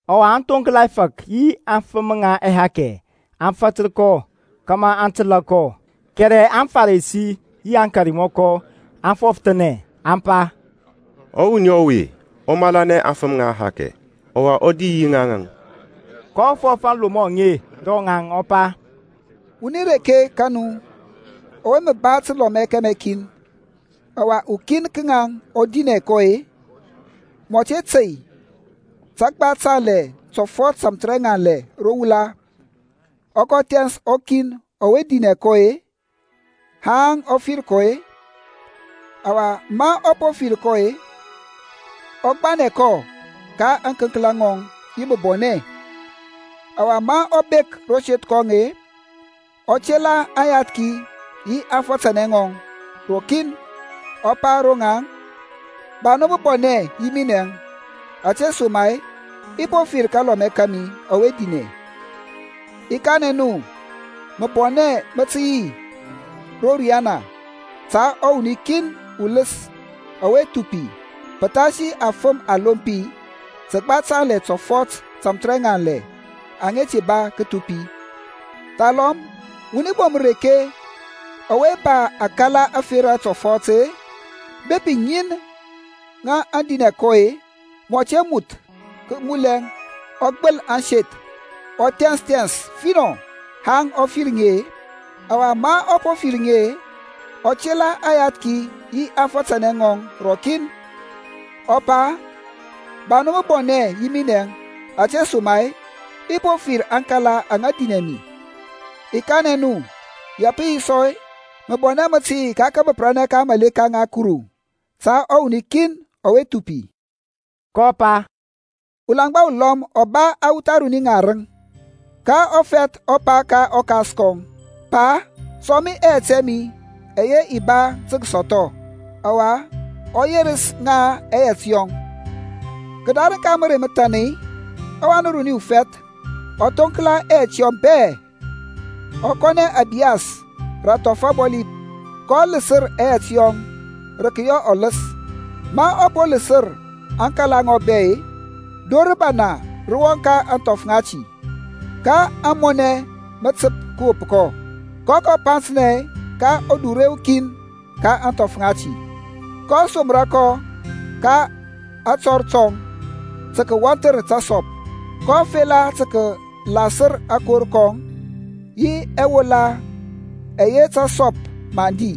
Ɔwa aŋthoŋkla ɛfȧk yi aŋfəm ŋa ɛhakɛ aŋ fatər kɔ kȧmȧ aŋ təlȧ kɔ. Kɛrɛ aŋFarisi yi aŋkarmɔkɔ aŋ fɔfəthanɛ, aŋ pa, Ɔwuni ɔwe ɔ malanɛ aŋfəm ŋa ɛhakɛ, ɔwa ɔ di yi ŋaŋ. kɔ fɔf aŋlomɔ aŋe ro ŋaŋ, ɔ pa, Wuni reke ka nu ɔwe mə ba təlɔmɛ kɛmɛ kin, ɔwa ukin ka ŋaŋ ɔ dinɛ kɔ-e, mɔ te tey tȧgba tanlɛ tɔfɔt tȧmthərɛŋanlɛ ro wula, ɔ kɔ thɛns ɔkin ɔwe dinɛ kɔ-e, haŋ ɔ fir kɔ-e? Ɔwa ma ɔ po fir kɔ-e, ɔ gbanɛ kɔ ka ȧŋkənklȧ ŋɔŋ yi məbɔnɛ. Ɔwa ma ɔ bek ro seth kɔŋ-e, ɔ tela aŋyathki yi aŋfatanɛ ŋɔŋ rɔkin, ɔ pa ro ŋaŋ, Ba nu məbɔnɛ yi minɛŋ, ȧtesoma-e i po fir kalɔmɛ kȧmi ɔwe dinɛ. I kanɛ nu məbɔnɛ mə tə yi ro riyana ta ɔwuni kin uləs ɔwe thupi pəthasi afəm alompi təgba tanlɛ tɔfɔt tȧmthərɛŋanlɛ aŋa te ba kəthupi. Thalɔm wuni bom ureke ɔwe ba akala ȧferȧ tɔfɔt-e, bepi ŋin aŋ dinɛ kɔ-e, mɔ te moth kəmulɛ, ɔ gbəl ȧŋseth, ɔ thɛns thɛns finɔ haŋ ɔ fir ŋi-e? Ɔwa ma ɔ po fir ŋi-e, ɔ tela aŋyathki yi aŋfatanɛ ŋɔŋ rɔkin, ɔ pa, Ba nu məbɔnɛ yi minɛŋ ȧtesoma-e i po fir aŋkala aŋa dinɛ mi. I kanɛ nu, ya pə yi sɔ-e, məbɔnɛ mə tə yi ka kȧbəprȧnɛ ka aŋmȧleka ŋa Kuru ta ɔwuni kin ɔwe thupi. kɔ pa, Ulaŋgba ulɔm ɔ ba awuth aruni ŋarəŋ; ka ɔfɛth ɔ pa ka ɔkas kɔŋ, Pa, sɔŋ mi ɛyɛt ɛ mi ɛyɛ i ba tə kəsɔthɔ. Ɔwa ɔ yerəs ŋa ɛyɛt yɔŋ. Kədarəŋ ka mərey məthan-e, ɔwan uruni ufɛth ɔ thoŋkla ɛyɛt yɔŋ bɛ-e, ɔ kɔnɛ ȧbiyas rə athɔf abɔli, kɔ ləsər ɛyɛt yɔŋ rə kəyɔ ɔləs. Ma ɔ po ləsər aŋkala ŋɔŋ bɛ-e, dor rəbana rə wɔŋ ka ȧŋthɔf ŋati, ka amɔnɛ mə təp kəwop kɔ. kɔ kɔ panthnɛ ka udure ukin ka ȧŋthɔf ŋati, kɔ somra kɔ ka atɔr tɔŋ tə kəwɔnthər təsɔp. kɔ fela tə kəlasər akor kɔŋ yi ɛwula ɛyɛ tasɔp mə aŋ di;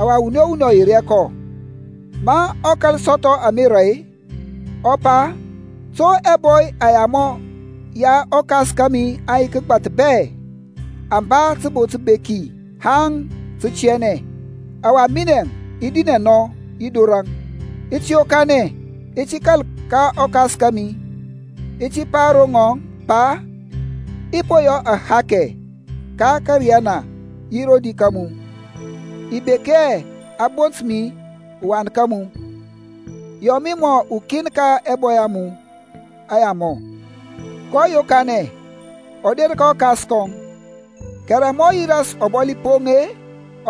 ɔwa wuni o wuni ɔ yer hɛ kɔ. Ma ɔ kȧl sɔthɔ amera-e, ɔ pa, To ɛbɔy ɛyamɔ ya ɔkas kȧmi aŋ yi kəgbath bɛ, aŋ ba təbo təbeki haŋ tə kətiyanɛ, ɔwa minɛŋ i dinɛ nɔ yi dorȧŋ! I ti yokanɛ, i ti kȧl ka ɔkas kȧmi, i ti pa ro ŋɔŋ, Pa, i po yɔ ahakɛ ka ȧriyana yi rodi ka mu. I bek hɛ a bont mi uwan ka mu. Yɔ mi mɔ ukin ka ɛbɔy ɛ mu ɛyamɔ. kɔ yokanɛ, ɔ der ka ɔkas kɔŋ, kɛrɛ ma ɔ yi ras ɔbɔli poŋ-e,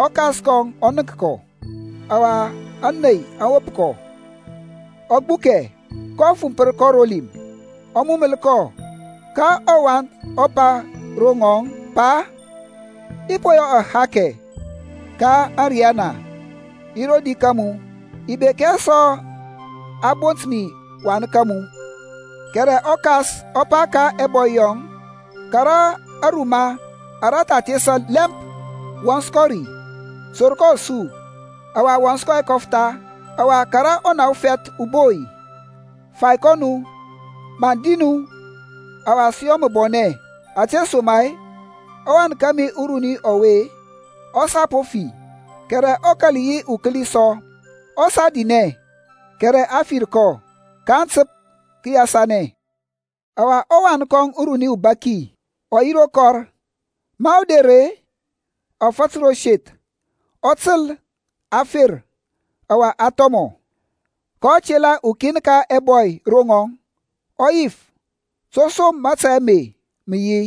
ɔkas kɔŋ ɔ nənk kɔ, ɔwa ȧney aŋ wop kɔ, ɔ gbukɛ, kɔ fumpər kɔ ro lim, ɔ muməl kɔ. Ka ɔwan ɔ pa ro ŋɔŋ, Pa, i po yɔ ahakɛ ka ȧriyana, yi rodi ka mu, i bek hɛ sɔ a bont mi uwan ka mu. Kɛrɛ ɔkas ɔ pa ka ɛbɔy yɔŋ, Kara aruma ara tha thesa lɛmp, wɔns kɔ ri. Sur kɔ asu, ɔwa wɔns kɔ ɛkɔftha; ɔwa kȧrȧ ɔna ufɛth uboi, fai kɔ nu. Maŋ di nu, ɔwa sə yɔ məbɔnɛ! Ȧtesoma-e ɔwan kȧmi uruni ɔwe ɔ sa po fi, kɛrɛ ɔ kȧl yi ukəli sɔ; ɔ sa dinɛ kɛrɛ a fir kɔ. Kaŋ təp kəyasanɛ. Ɔwa ɔwan kɔŋ uruni ɔbaki ɔ yi ro kɔr. Ma ɔ der-e, ɔ fatər ro seth, ɔ təl a fer, ɔwa a thɔmɔ. kɔ tela ukin ka ɛbɔy ro ŋɔŋ, ɔ yif to som mȧtȧy ame mə yi.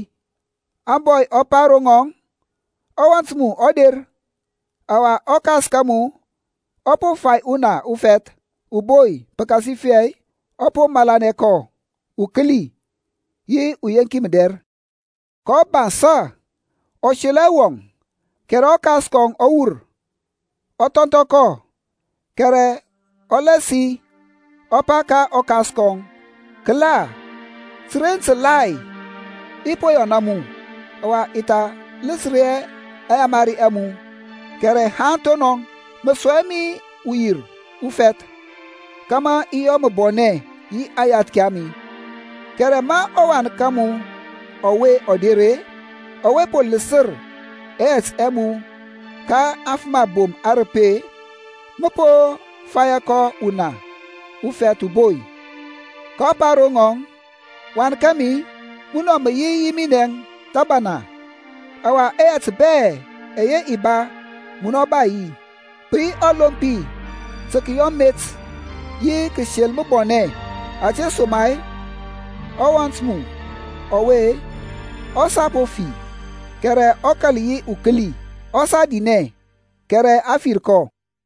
Ȧŋbɔy ɔ pa ro ŋɔŋ, Ɔwɔnt mu ɔ der, ɔwa ɔkas ka mu ɔ po fai ɔna ufɛth uboi pəkasifɛ ɔ po malanɛ kɔ ukəli yi uyeŋki mədɛr. kɔ bansȧ ɔ selɔ hɛ wɔŋ, kɛrɛ ɔkas kɔŋ ɔ wur, ɔ thɔnthɔ kɔ. Kɛrɛ ɔ lasi ɔ pa ka ɔkas kɔŋ, Kəla, təren tǝgbȧthi i po yɔna mu, ɔwa i tha ləsər hɛ aŋyamari a mu; kɛrɛ haŋ thonɔŋ mə sɔŋ hɛ mi uwir ufɛth kȧmȧ i yɔ məbɔnɛ yi aŋyathki a mi. Kɛrɛ ma ɔwan ka mu ɔwe ɔ der-e, ɔwe po ləsər ɛyɛt ɛ mu ka afəm abom arəpi-e, mə po fayȧ kɔ ɔna ufɛth uboi. kɔ pa ro ŋɔŋ, Wan kȧmi, munɔ mə yi yi minɛŋ thəbana, ɔwa ɛyɛt bɛ ɛyɛ i ba, munɔ ba yi. Pə yi ɔlompi tə kəyɔ met yi kəsel məbɔnɛ, ȧtesoma-e ɔwɔnt mu ɔwe ɔ sa po fi, kɛrɛ ɔ kȧl yi ukəli, ɔ sa dinɛ, kɛrɛ a fir kɔ.